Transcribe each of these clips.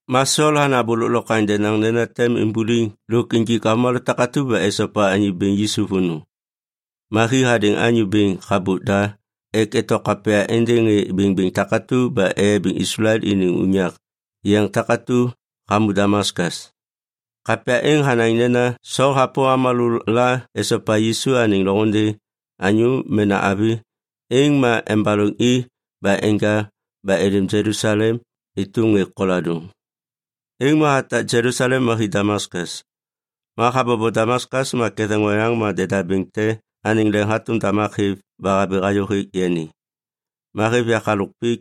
Ma Sol hanaŋ abô lôklokwaŋ denaŋ nena tem imbuliŋ lôk injik avômalô takatu ba esopa Anyô Bêŋ Yisu vônô. Ma hi hadêŋ anyô bêŋ habôk da ek eto kapya êndêŋ ŋê bêŋbêŋ takatu ba eyabiŋ Islael iniŋ unyak yeŋ takatu hamô Damaskas. Kapya êŋ hanaŋ nena Sol hapôm avômalô la esopa Yisu anêŋ loŋôndê, anyô mena avi, êŋ ma embaloŋ i ba enja ba êlêm Jelusalem êtôm ŋê koladôŋ. Êŋ ma hatak Jelusalem ma hi Damaskas. Ma habobo Damaskas ma ketheŋ oyaŋ ma deda bêŋ te anêŋ leŋ hatôm damak hêv ba habi hayô hêk yani. Ma hêv yak halôk pik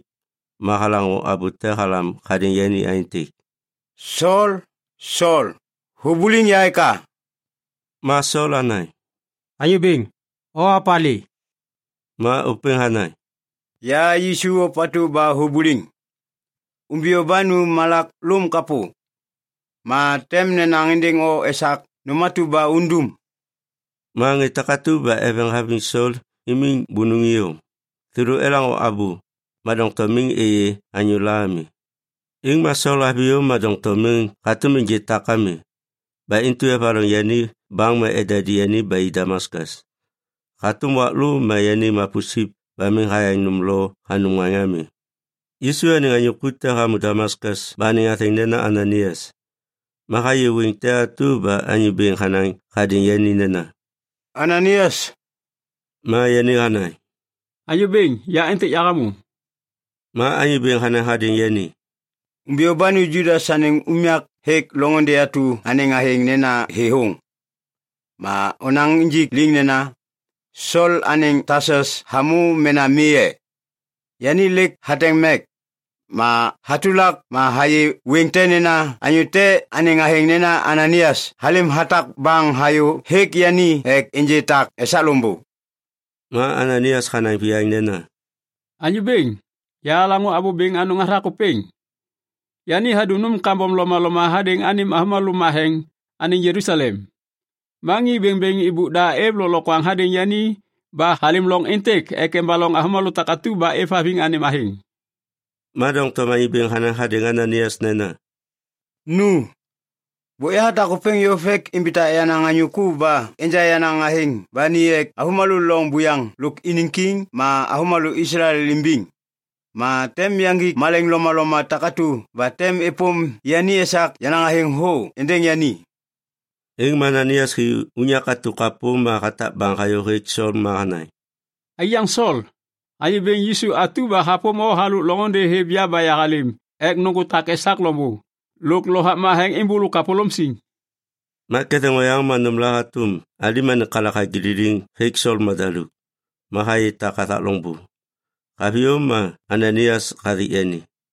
ma halaŋô abô te halam hadêŋ yani aêntêk, “Sol, Sol, hubuliŋ ya eka?” Ma Sol hanaŋ, “Anyô Bêŋ, o opalê?” Ma ôpêŋ hanaŋ, “Ya Yisu ôpatu ba hubuliŋ. Umbiyô ba nu malak lôŋ kapô. Ma tem nenaŋ êndêŋ o esak nôm atu ba undum.” Ma ŋê takatu ba eveŋ haviŋ Sol imiŋ bônôŋ iyom. Thêlô elaŋô abô, ma doŋtom miŋ êyê anyôla ami. Êŋ ma Sol haviyô ma doŋtom miŋ hatôm ênjê tak ami. Ba intu evaloŋ yani baŋ ma edadi ba i Damaskas. Hatôm wak lô ma yani mapusip ba miŋ hayaŋ nôm lo hanum ŋaŋ ami. Yisu anêŋ anyô ku te hamô Damaskas ba anêŋ athêŋ nena Ananaias. Ma hayê wêŋ te atu ba Anyô Bêŋ hanaŋ hadêŋ yani nena, “Ananaias!” Ma yani hanaŋ, “Anyô Bêŋ, ya êntêk yahamô.” Ma Anyô Bêŋ hanaŋ hadêŋ yani, “Umbiyô ba nu Judas anêŋ unyak hêk loŋôndê atu anêŋ athêŋ nena Thêthôŋ. Ma onaŋ injik liŋ nena, ‘Sol anêŋ Tasus hamô mena mi e?’ Yani lêk hateŋ mek. Ma hatulak ma hayê wêŋ te nena anyô te anêŋ athêŋ nena Ananaias halêm hatak baŋ hayô hêk yani ek ênjê tak esak loŋbô.” Ma Ananaias hanaŋ viyaŋ nena, “Anyô Bêŋ, yahalaŋô abô bêŋ anôŋ hathak ôpêŋ. Yani hadum nôm kambom lomaloma hadêŋ anêm avômalô matheŋ anêŋ Jelusalem. Ma ŋê bêŋbêŋ êbôk da êv lôklokwaŋ hadêŋ yani ba halêm loŋ êntêk ek embaloŋ avômalô takatu ba êvhaviŋ anêm athêŋ.” Ma doŋtom Anyô Bêŋ hanaŋ hadêŋ Ananaias nena, “Nu. Bôk yahatak ôpêŋ yôv ek imbitak yenaŋ anyô ku ba enja yenaŋ athêŋ ba ni ek avômalô loŋ buyaŋ lôk iniŋ kiŋ ma avômalô Islael imbiŋ. Ma tem yaŋgik malaiŋ lomaloma takatu ba tem êpôm yani esak yenaŋ athêŋ thô êndêŋ yani.” Êŋ ma Ananaias hi unyak atu kapô ma hatak baŋ hayô hêk Sol ma hanaŋ, “Aiyaŋ Sol, Anyô Bêŋ Yisu atu ba hapôm o halôk loŋôndê hêv ya ba yahalêm ek nôŋgô tak esak loŋbô lôk Lovak Matheŋ êmbôlô kapôlôm siŋ.” Ma ketheŋ oyaŋ ma nômla hatôm alim anêŋ kalak hagililiŋ hêk Sol madaluk. Ma hayê tak hathak loŋbô. Haviyô ma Ananaias hathik yani.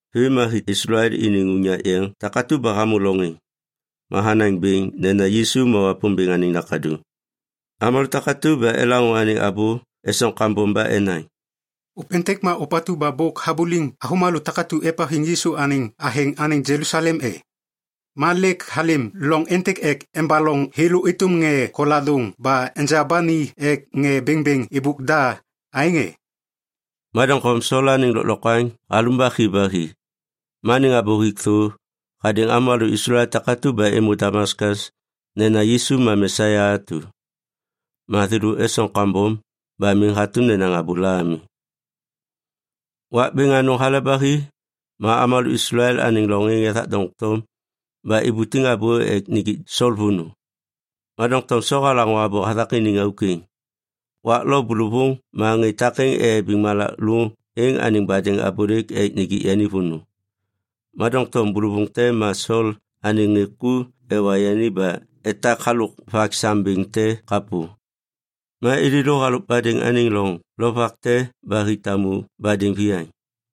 Vêm ma hi Islael iniŋ unyak yeŋ takatu ba hamô loŋ êŋ, ma hanaŋ bêŋ nena Yisu ma Wapômbêŋ anêŋ Nakaduŋ. Avômalô takatu ba elaŋô anêŋ abô esoŋ kambom ba enaŋ, “Ôpêntêk ma ôpatu ba bôk habuliŋ avômalô takatu ba êvhaviŋ Yisu anêŋ athêŋ anêŋ Jelusalem e? Ma lêk halêm loŋ êntêk ek embaloŋ thêlô êtôm ŋê koladôŋ ba enja ba ni ek ŋê bêŋbêŋ êbôk da, aêŋ e?” Ma doŋtom Sol anêŋ lôklokwaŋ halumbak hi ba hi. Ma anêŋ abô hik thô hadêŋ avômalô Islael takatu ba êmô Damaskas nena Yisu ma Mesia atu. Ma thêlô esoŋ kambom ba miŋ hatôm nenaŋ abôla ami. Wak bêŋ anôŋ hale ba hi ma avômalô Islael anêŋ loŋ êŋ ethak doŋtom ba ibutiŋ abô ek nijik Sol vônô. Ma doŋtom Sol halaŋô abô hathak iniŋ auk êŋ. Wak lo bôlôvôŋ ma ŋê takêŋ eyabiŋ malak lôŋ êŋ anêŋ badêŋ abôlêk ek nijik yani vônô. Ma doŋtom bôlôvôŋ te ma Sol anêŋ ŋê ku ewa yani ba etak halôk vak sam bêŋ te kapô. Ma êlêlô halôk badêŋ anêŋ loŋ lovak te ba hi tamu badêŋ viyaŋ.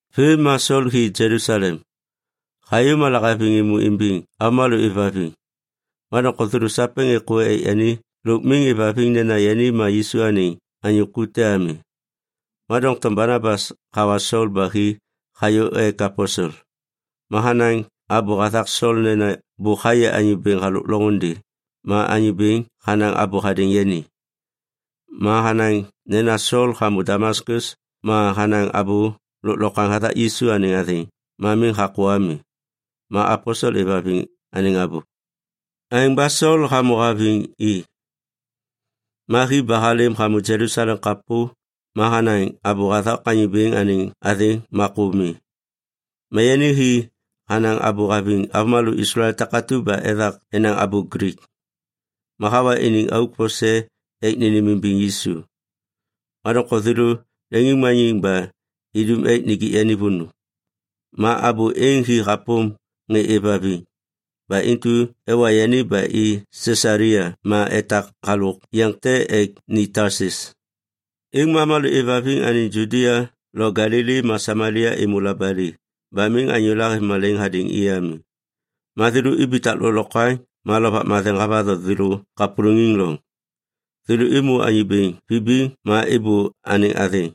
Vêm ma Sol hi Jelusalem. Hayô ma lahaviŋ êmô imbiŋ avômalô êvhaviŋ, ma doŋtom thêlô sapêŋ êkô ek yani lôk miŋ êvhaviŋ nena yani ma Yisu anêŋ anyô ku te ami. Ma doŋtom Banabas hawa Sol ba hi hayô ek aposel. Ma hanaŋ abô hathak Sol nena bôk hayê Anyô Bêŋ halôk loŋôndê ma Anyô Bêŋ hanaŋ abô hadêŋ yani. Ma hanaŋ nena Sol hamô Damaskas ma hanaŋ abô lôklokwaŋ hathak Yisu anêŋ athêŋ ma miŋ hakô ami. Ma aposel êvhaviŋ anêŋ abô. Aêŋ ba Sol hamô haviŋ i. Ma hi ba halêm hamô Jelusalem kapô ma hanaŋ abô bêŋ hathak Anyô Bêŋ anêŋ athêŋ ma kô mi. Ma yani hi hanaŋ abô haviŋ avômalô Islael takatu ba ethak enaŋ abô Glik. Ma hawa iniŋ auk vose ek nênêmimbiŋ Yisu. Ma doŋtom thêlô leŋiŋmaniŋ ba idum ek nijik yani vônô. Ma abô êŋ hi hapôm ŋê êvhaviŋ. Ba intu ewa yani ba i Sisalia ma etak halôk yeŋ te ek ni Tasus. Êŋ ma avômalô êvhaviŋ anêŋ Judia lo Galili ma Samalia êmô labali ba miŋ anyôla hêv malaiŋ hadêŋ i ami. Ma thêlô ibitak lôklokwaŋ ma Lovak Matheŋ havatho thêlô kapôlôŋiŋ loŋ. Thêlô êmô Anyô Bêŋ vibiŋ ma êbô anêŋ athêŋ.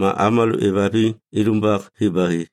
Ma avômalô êvhaviŋ ilumbak hi ba hi.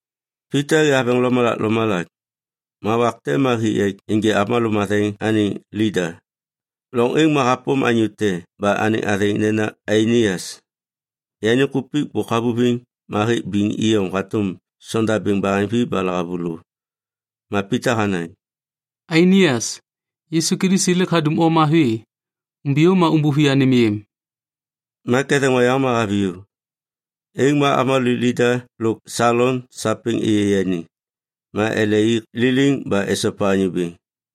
Pita hi haveŋ lomalak lomalak. Ma wak te ma hi ek ênjê avômalô matheŋ anêŋ Lida. Loŋ êŋ ma hapôm anyô te ba anêŋ athêŋ nena Ainias. Yani kupik bôk havuviŋ ma hêk biŋ iyom hatôm sondabêŋ baheŋvi ba lahavulô. Ma Pita hanaŋ, “Ainias, Yisu Kilisi lêk hadum o mavi. Umbiyô ma umbuvi anêm yêm.” Ma ketheŋ oyaŋ ma haviyô. Êŋ ma avômalô Lida lôk Salon sapêŋ êyê yani, ma ele i liliŋ ba esopa Anyô Bêŋ.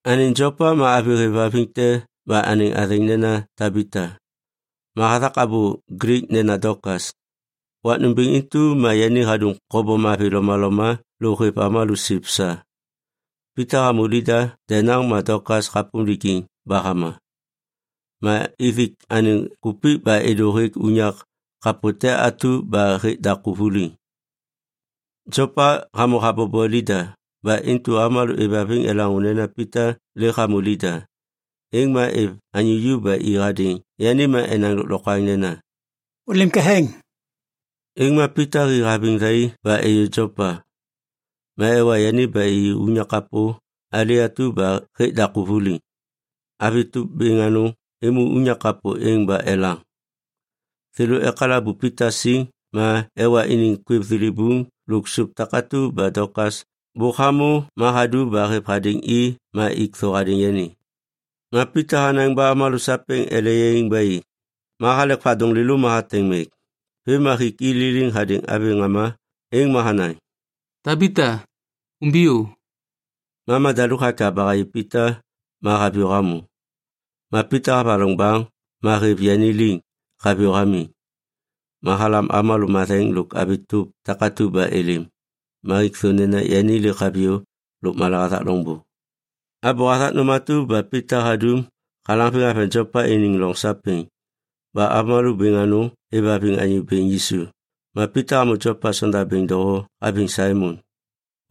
Anêŋ Jopa ma avi êvhaviŋ te ba anêŋ athêŋ nena Tabita, ma hathak abô Glik nena Dokas. Wak nômbêŋ intu ma yani hadum kobom mavi lomaloma lôk hêv avômalô siv sa. Pita hamô Lida denaŋ ma Dokas hapôm lijiŋ ba hama. Ma ithik anêŋ kupik ba êdô hêk unyak kapô te atu ba hêk daku vuliŋ. Jopa hamô habobo Lida ba intu avômalô êvhaviŋ elaŋô nena Pita lêk hamô Lida, êŋ ma êv anyô ju ba i hadêŋ yani ma enaŋ lôklokwaŋ nena, “Ôlêm ketheŋ!” Êŋ ma Pita hi haviŋ thai ba êyô Jopa. Ma ewa yani ba i unyak kapô ali atu ba hêk daku vuliŋ. Avi tôp bêŋ anôŋ êmô unyak kapô êŋ ba elaŋ. Thêlô ekalabu Pita siŋ ma ewa iniŋ kwêv thilibuŋ lôk sôp takatu ba Dokas bôk hamô ma hadu ba hêv hadêŋ i ma ik thô hadêŋ yani. Ma Pita hanaŋ ba avômalô sapêŋ ele yaiŋ ba i. Ma halek vadôŋ lêlô ma hateŋ mek. Vêm ma hik i liliŋ hadêŋ avi ŋama êŋ ma hanaŋ, “Tabita, umbiyô.” Ma madaluk hakyav ba hayê Pita ma haviyô hamô. Ma Pita havaloŋ baŋ ma hêv yani liŋ haviyô hamiŋ. Ma halam avômalô matheŋ lôk avi tôp takatu ba êlêm. Ma hik thô nena yani lêk haviyô lôkmala hathak loŋbô. Abô hathak nôm atu ba Pita hadum halaŋviŋ haveŋ Jopa iniŋ loŋ sapêŋ ba avômalô bêŋ anôŋ êvhaviŋ Anyô Bêŋ Yisu. Ma Pita hamô Jopa sonda doho haviŋ Saimon,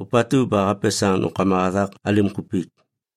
ôpatu ba hapesaŋ nômkama hathak alim kupik.